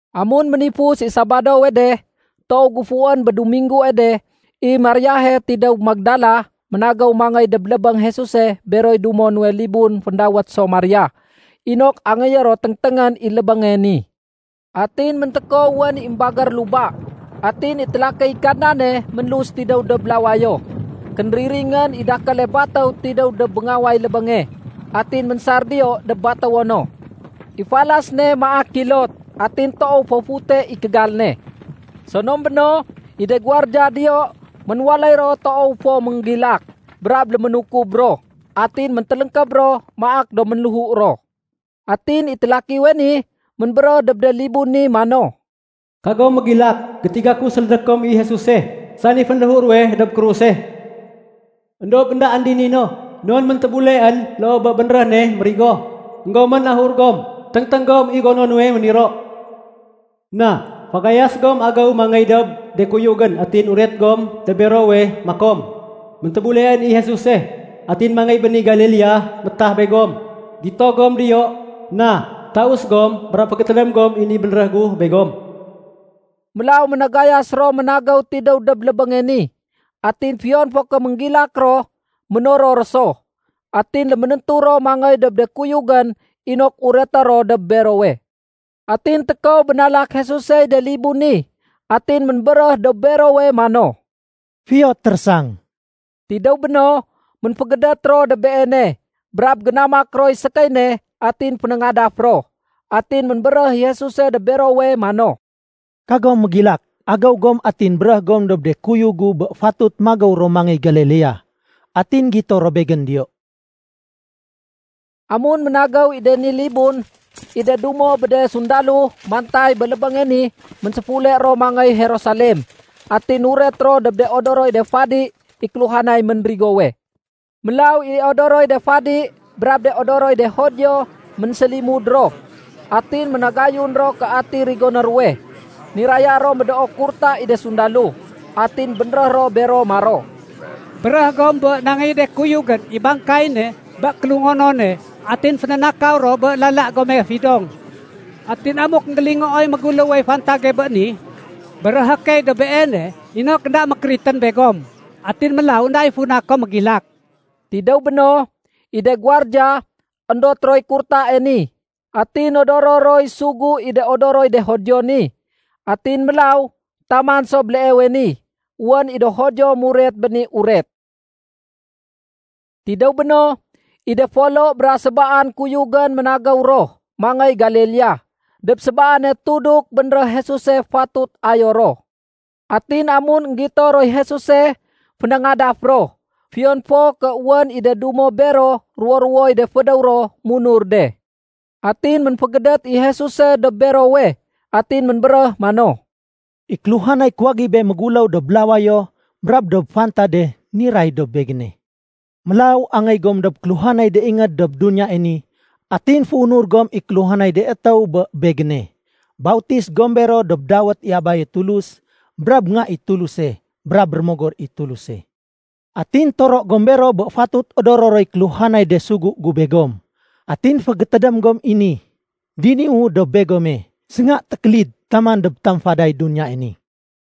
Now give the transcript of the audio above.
Amun ménifus i Sabadowe de, toow géfuwén bé Duminggue de, i Mariahe tidéw Magdala ménagéw mangéy dob lébéng Jesuse beroy dumo nuwe libun féndawét so Maria inok angéyé ro téngténgén i lébénge ni. Atin méntékow wén i émbagér luba, atin i télakiy Kadnane ménlus tidéw dob lawayo. Kénriringén i dakéle batéw tidéw dob béngaway lébénge, atin ménsar diyo dob batéwo no. I falas ne maak kilot atin toow fo fute i kégal ne. Sonom béno, i de guwardiya diyo ménwaléy ro toow fo ménggilak, brab léménukub ro. Atin méntéléngkéb ro maak do ménléhu ro. Atin i télakiwe ni ménbéréh dob de libun ni mano, “Kagom mégilak, Gétiga ku sélédé kom i Jesuse, sani fénléhu ruwe dob kruse. Endob éndaén dini no, non méntébuleén loo bé bénréh ne mérigo. Enggomén ahur gom, téngténg gom i gono nuwe méniro. Na, fagayas gom agéw mangéy dob de kuyugén atin uret gom dob berowe makom, ‘Méntébuleén i Jesuse. Atin mangéy béni Galilea métah begom. Gito gom diyo.’ Na, taus gom brab fégétédém gom i ni bénréh gu begom.” Mélaw ménagayas ro ménagéw tidéw dob lébénge ni. Atin fiyon fo ké ménggilak ro, ménoror ro so. Atin léménéntu ro mangéy dob de kuyugén inok ureté ro dob berowe. Atin tékow bénalak Jesusey de libun ni atin ménbéréh dob berowe mano, “Fiyo térésang.” Tidéw béno, ménfégédét ro dob Beene brab génamak roy sékéy ne atin fénéngadaf ro. Atin ménbéréh i Jesuse dob berowe mano, “Kagom mégilak. Agéw gom atin béréh gom dob de kuyug gu bé fatut magéw ro mangéy Galilea, atin gito ro Begén diyo.” Amun ménagéw i de ni libun, i de dumo bé de sundalo mantay bé lébénge ni ménséfule ro mangéy Jerusalem atin nuret ro dob de odoroy de fadi i kéluhanay ménrigowe. Mélaw i de odoroy de fadi brab de odoroy de Judio, ménsélimud ro. Atin ménagayun ro ké ati rigoné ruwe. Niraya ro médoo kurta i de sundalo. Atin bénréh ro bero maro, “Béréh gom bé nangéy i de kuyugén i bangkay ne bé kélungonone atin fénénakaw ro bé lala gome fidong. Atin amuk énggélingooy méguléwey fantage bé ni, béréhé key dob beene inok énda mékéritén begom atin mélaw énda i funa kom mégilak.” Tidéw béno, i de guwardiya, éndot roy kurtae ni atin nodoro roy sugu i de odoroy de Judio ni. Atin mélaw, taman so béleewe ni, wén i do Judio muret bé ni uret. Tidéw béno, i de folo bra sébaan kuyugén ménagéw ro mangéy Galilea dob sébaane tuduk bénréh Jesuse fatut ayo ro. Atin amun énggito roy Jesuse, fénéngadaf ro, fiyon fo ké wén i de dumo bero ruwo-ruwoy de fédéw ro munur de. Atin ménfégédét i Jesuse dob berowe atin ménbéréh mano, “I kéluhanay kuwagibé méguléw dob lawayo brab dob fantade niray dob Begéne. Mélaw angéy gom dob kéluhanay de ingéd dob duniyae ni atin féunur gom i kéluhanay de étéw bé Begéne. Bautis gom bero dob dawét i Abaye Tulus, brab Nga i Tuluse, brab Rémogor i Tuluse. Atin toro gom bero bé fatut odoro roy kéluhanay de sugu gu begom. Atin fégétédém gom i ni, diniwu dob begome sénga tékélid taman dob tamfaday duniyae ni.”